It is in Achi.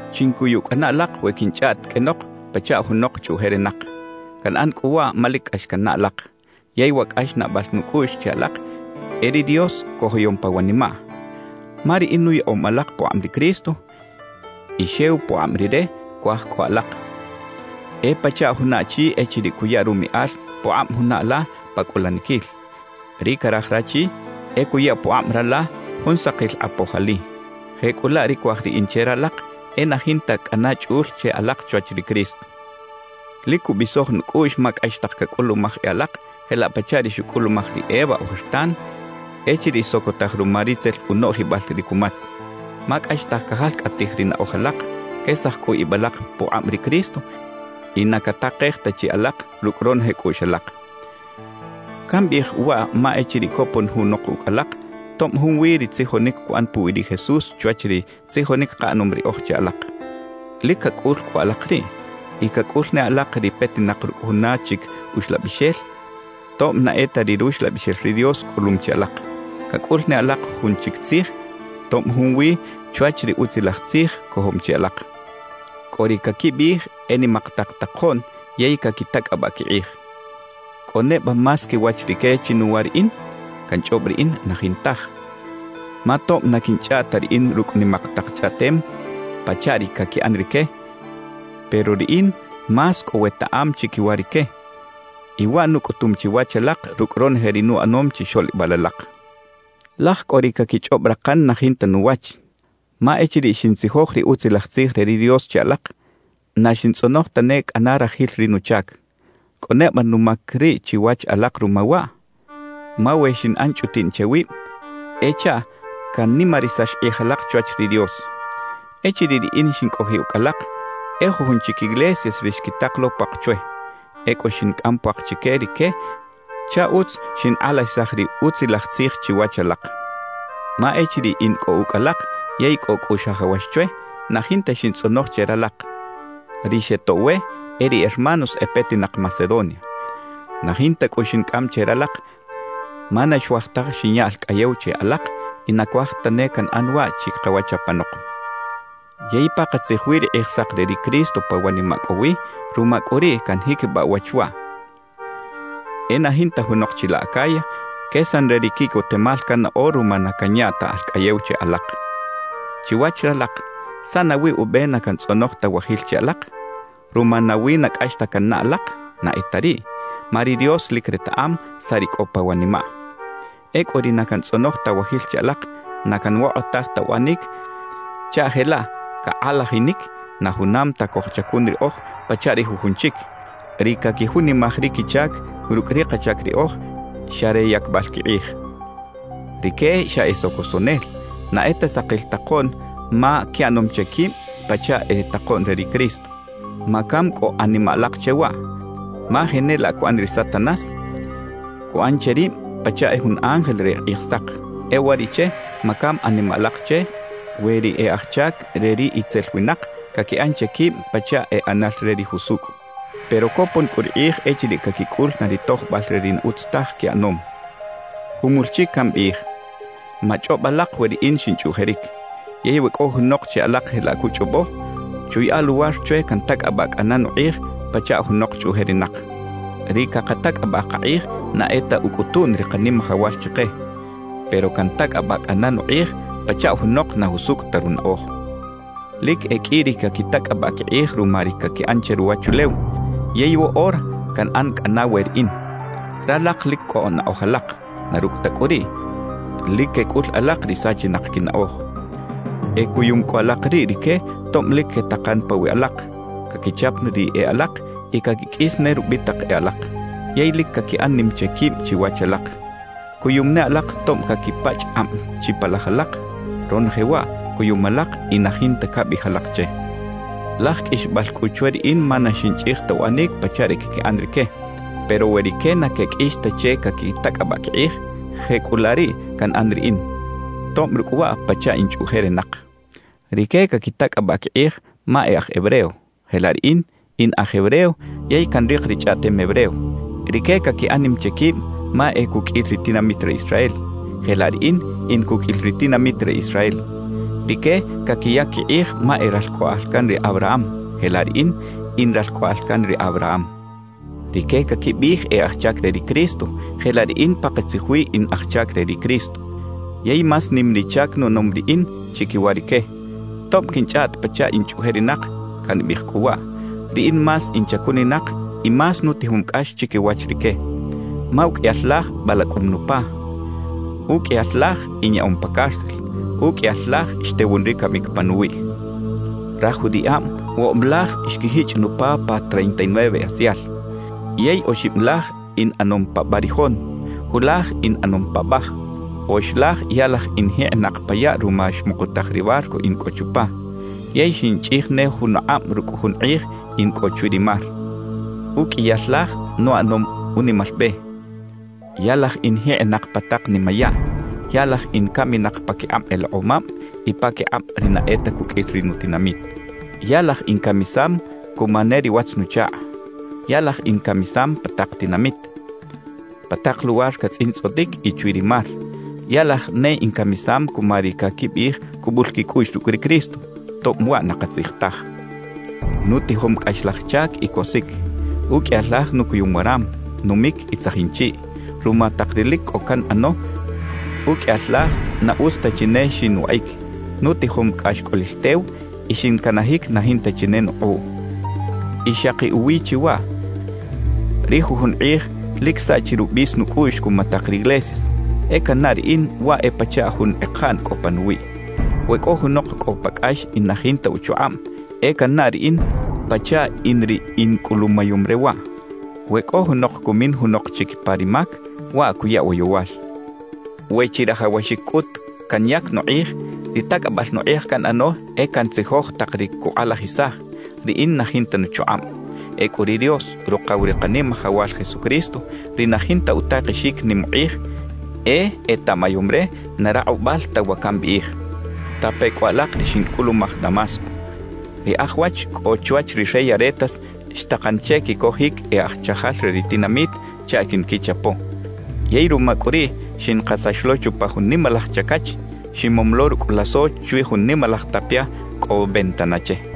Chincuyu cꞌana alak we quinchꞌaꞌt qꞌuenok pachaꞌ junok chꞌuꞌjerinak. Canꞌan cꞌu waꞌ ma lic cꞌax cannaꞌ alak, yey wa cꞌaxnaꞌbal nucꞌuꞌx che alak e ri Dios cojoyom pa wanimaꞌ. Ma riꞌin nuyaꞌom alak pukꞌab ri Cristo y xew pukꞌab Rire cuaj cꞌo alak. E pachaꞌ juna achi echiriꞌ cuya rumiꞌal pukꞌab juna ala pa cꞌulaniquil. Ri caraj rachi e cuya pukꞌab rala jun sakil kꞌapoj ali. Jecꞌulaꞌ ri cuaj riꞌin che ralak e na jinta cꞌana chꞌul che alak chwach ri Cristo. Lic cubisoj nucꞌuꞌx ma cꞌaxtaj cacꞌulumaj e alak jelaꞌ pachaꞌ ri xucꞌulumaj ri Eva ojertan echiriꞌ xsocotaj ruma ri tzel unoꞌjibal ri cumatz. Ma cꞌaxtaj cajalcꞌataj ri naꞌoj alak, quesaj cꞌu ib alak pukꞌab ri Cristo y na catakej ta chi alak rucꞌ ronoje cꞌuꞌx alak. Cambiꞌij waꞌ ma echiriꞌ copon junok ucꞌ alak, tob junwi ri tzijonic cuꞌan puwi ri Jesús chwach ri tzijonic kaꞌanom riꞌoj che alak, ¡lic cacꞌul cꞌu alak riꞌ! Y cacꞌul ne alak ri petinak rucꞌ juna chic uxlabixel, tob na e ta ri Ruxlabixel ri Dios cꞌulum chi alak. Cacꞌul ne alak jun chic tzij, tob junwi chwach ri Utzilaj Tzij cojom chi alak. Cꞌo ri caquibiꞌij e nimak tak takoꞌn yey caquitacꞌabaꞌ quikꞌij. ¿Cꞌo neba más quiwach rique chinuwa riꞌin? Canchꞌob riꞌin, na jintaj. Ma tob na quinchꞌaꞌt ta riꞌin rucꞌ nimak tak chꞌaꞌtem pachaꞌ ri caquiꞌan rique, pero riꞌin más cꞌo wetaꞌam chiquiwa rique; y waꞌ nucꞌutum chiwach alak rucꞌ ronoje ri nuꞌanom chixoꞌlibal alak. Laj cꞌo ri caquichꞌob rakan na jinta nuwach; ma echiriꞌ xintzijoj ri Utzilaj Tzij re ri Dios che alak, na xintzꞌonoj tane cꞌana rajil ri nuchac. ¿Cꞌo neba numac riꞌ chiwach alak ruma waꞌ? Ma we xinꞌan chꞌutiꞌn che wib, e chaꞌ canimarisax kꞌij ralak chwach ri Dios. Echiriꞌ riꞌin xincꞌojiꞌ ucꞌ alak, e jujun chic iglesias ri xquitak lo puak chwe. Ecꞌu xincꞌam puak chique rique chaꞌ utz xinkꞌalajisaj ri Utzilaj Tzij chiwach ralak. Ma echiriꞌ in cꞌo ucꞌ alak yey cꞌo cꞌu xajawax chwe, na jinta xintzꞌonoj che ralak. Ri xetoꞌw we e ri hermanos e petinak Macedonia. Na jinta cꞌu xincꞌam che ralak ma na xuaj taj xinya alcꞌayew che alak y na cuaj tane canꞌan waꞌ chikawach apanok. Yey pakatzij wi ri Kꞌijsak re ri Cristo pa wanimaꞌ cꞌo wi; ruma cꞌu riꞌ canjiquibaꞌ uwach waꞌ: E na jinta junok chilaꞌ Acaya quesan re ri quiꞌcotemal cannaꞌo ruma na canya ta alcꞌayew che alak. Chiwach ralak, ¿saꞌ nawi ube na cantzꞌonoj ta wajil che alak? ¿Ruma nawi na cꞌax ta cannaꞌ alak? Na e ta riꞌ, ma ri Dios lic retaꞌam saꞌ ri cꞌo pa wanimaꞌ. Ecꞌu ri na cantzꞌonoj ta wajil che alak, na canwokꞌotaj ta uꞌanic chaꞌ jelaꞌ cakꞌalajinic na junam ta cojchacun riꞌoj pachaꞌ ri jujun chic, ri caquijunimaj ri quichac rucꞌ ri kachac riꞌoj xa re yacbal quikꞌij. Rique xa e socosoꞌnel, na e ta sakil takoꞌn ma quiꞌanom che quib pachaꞌ e takoꞌn re ri Cristo. Macam cꞌu animaꞌ alak che waꞌ; ma jenelaꞌ cuꞌan ri Satanás, cuꞌan che rib pachaꞌ e jun ángel re Kꞌijsak. E uwariꞌche macam animaꞌ alak che we ri e aj chac re ri itzel winak caquiꞌan che quib pachaꞌ e ꞌanal re ri jusucꞌ. Pero copon cꞌu ri kꞌij echiriꞌ caquicꞌul na ri tojbal re ri na utz taj quiꞌanom. Jumul chic cambiꞌij: Machꞌob alak we riꞌin xinchꞌuꞌjeric. Yey we cꞌo junok che alak jelaꞌ cuchꞌobo, chuyaꞌa luwar chwe cantacꞌabaꞌ cꞌana nukꞌij pachaꞌ junok chꞌuꞌjerinak. Ri cakatacꞌabaꞌ kakꞌij na e ta ucꞌutuꞌn ri Kanimajawal chike; pero cantacꞌabaꞌ cꞌana nukꞌij pachaꞌ junok na jusucꞌ ta runaꞌoj. Lic e qꞌui ri caquitacꞌabaꞌ quikꞌij ruma ri caquiꞌan che ruwachulew, yey woꞌora canꞌan cꞌana we riꞌin. Ralak lic cꞌo naꞌoj alak; na rucꞌ ta cꞌu riꞌ, lic quecꞌul alak ri sachinak quinaꞌoj. E cuyum cꞌu alak riꞌ rique tob lic quetakan pawiꞌ alak, caquichap ri e alak y caquiqꞌuis ne rubitak e alak, yey lic caquiꞌan nim che quib chiwach alak. ¡Cuyum ne alak tob caquipachꞌ kꞌab chipalaj alak! Ronoje waꞌ cuyum alak y na jinta cabiꞌij alak che. Laj qꞌuixbal cꞌu chwe riꞌin ma na xinchꞌij ta uꞌanic pachaꞌ ri caquiꞌan rique. Pero we rique na queqꞌuix ta che caquitacꞌabaꞌ quikꞌij, jecꞌulaꞌ riꞌ canꞌan riꞌin, tob rucꞌ waꞌ pachaꞌ in chꞌuꞌjerinak. Rique caquitacꞌabaꞌ quikꞌij ma e aj hebreo; jelaꞌ riꞌin, in aj hebreo yey canrik ri chꞌaꞌtem hebreo. Rique caquiꞌan nim che quib ma e cuqꞌuil ri tinamit re Israel, jelaꞌ riꞌin in cuqꞌuil ri tinamit re Israel. Rique caquiyac quikꞌij ma e ralcꞌoꞌal can ri Abraham; jelaꞌ riꞌin, in ralcꞌoꞌal can ri Abraham. Rique caquibiꞌij e aj chac re ri Cristo, jelaꞌ riꞌin pakatzij wi in aj chac re ri Cristo yey más nim ri chac nuꞌanom riꞌin chiquiwa rique. Tob quinchꞌaꞌt pachaꞌ in chꞌuꞌjerinak, cambiꞌij cꞌu waꞌ: Riꞌin más in chacuninak y más nutijom cꞌax chiquiwach rique. Ma uqꞌuiyal laj balacꞌum nupa, uqꞌuiyal laj inyaꞌom pa cárcel, uqꞌuiyal laj xtewun ri camic panuwiꞌ. Raj judiꞌab woꞌob laj xquijichꞌ nupa pa treinta y nueve asial. Yey oxib laj in ꞌanom pa barijon, julaj in ꞌanom paꞌbaj. Oxlaj ya laj in jikꞌinak pa yaꞌ ruma xmukutaj ri barco in cꞌo chupa, yey xinchꞌij ne jun akꞌab rucꞌ jun kꞌij in cꞌo chwi ri mar. Uqꞌuiyal laj nuꞌanom unimal be. Ya laj in jikꞌinak pa tak nimayaꞌ. Ya laj in caminak paquikꞌab elekꞌomab y paquikꞌab ri na e ta cuqꞌuil ri nutinamit. Ya laj incamisam cuma ne ri watz-nuchakꞌ. Ya laj incamisam pa tak tinamit, pa tak luwar catzꞌintzꞌotic y chwi ri mar. Ya laj ne incamisam cuma ri caquibiꞌij cubul quicꞌuꞌx rucꞌ ri Cristo, tob waꞌ na katzij taj. Nutijom cꞌaxlaj chac y cosic. Uqꞌuiyal laj nucuyum waram, numic y tzajin chiꞌ. Ruma tak ri lic cꞌo canꞌano, uqꞌuiyal laj na utz ta chi ne xinwaꞌic. Nutijom cꞌaxcꞌolil tew y xincanajic na jinta chi ne nukꞌuꞌ. Y xaki uwi chi waꞌ, ri jujun kꞌij lic saꞌchi rubis nucꞌuꞌx cuma tak riglesias; e cannaꞌ riꞌin waꞌ e pachaꞌ jun ekaꞌn cꞌo panuwiꞌ. We cꞌo junok cꞌo pa cꞌax y na jinta uchukꞌab, e cannaꞌ riꞌin pachaꞌ in ri incꞌulumayom re waꞌ. We cꞌo junok cumin junok chic pa ri mac, waꞌ cuya woyowal. We chirajawaxic cꞌut canyac nukꞌij, ri tacꞌabal nukꞌij canꞌano e cantzijoj tak ri cukꞌalajisaj, riꞌin na jinta nuchukꞌab. Ecꞌu ri Dios, Rukaw ri Kanimajawal Jesucristo ri na jinta utakexic nim ukꞌij, e etaꞌmayom re na rakꞌubal ta wa cambiꞌij. Tape cꞌu alak ri xincꞌulumaj Damasco: Ri aj wach cꞌo chwach ri rey Aretas xtakan che quicojic e aj chajal re ri tinamit chaꞌ quinquichapo. Yey ruma cꞌu riꞌ xinkasax lo chupa jun nimalaj chacach, ximom lo rucꞌ lazo chwi jun nimalaj tapia cꞌo ventana che.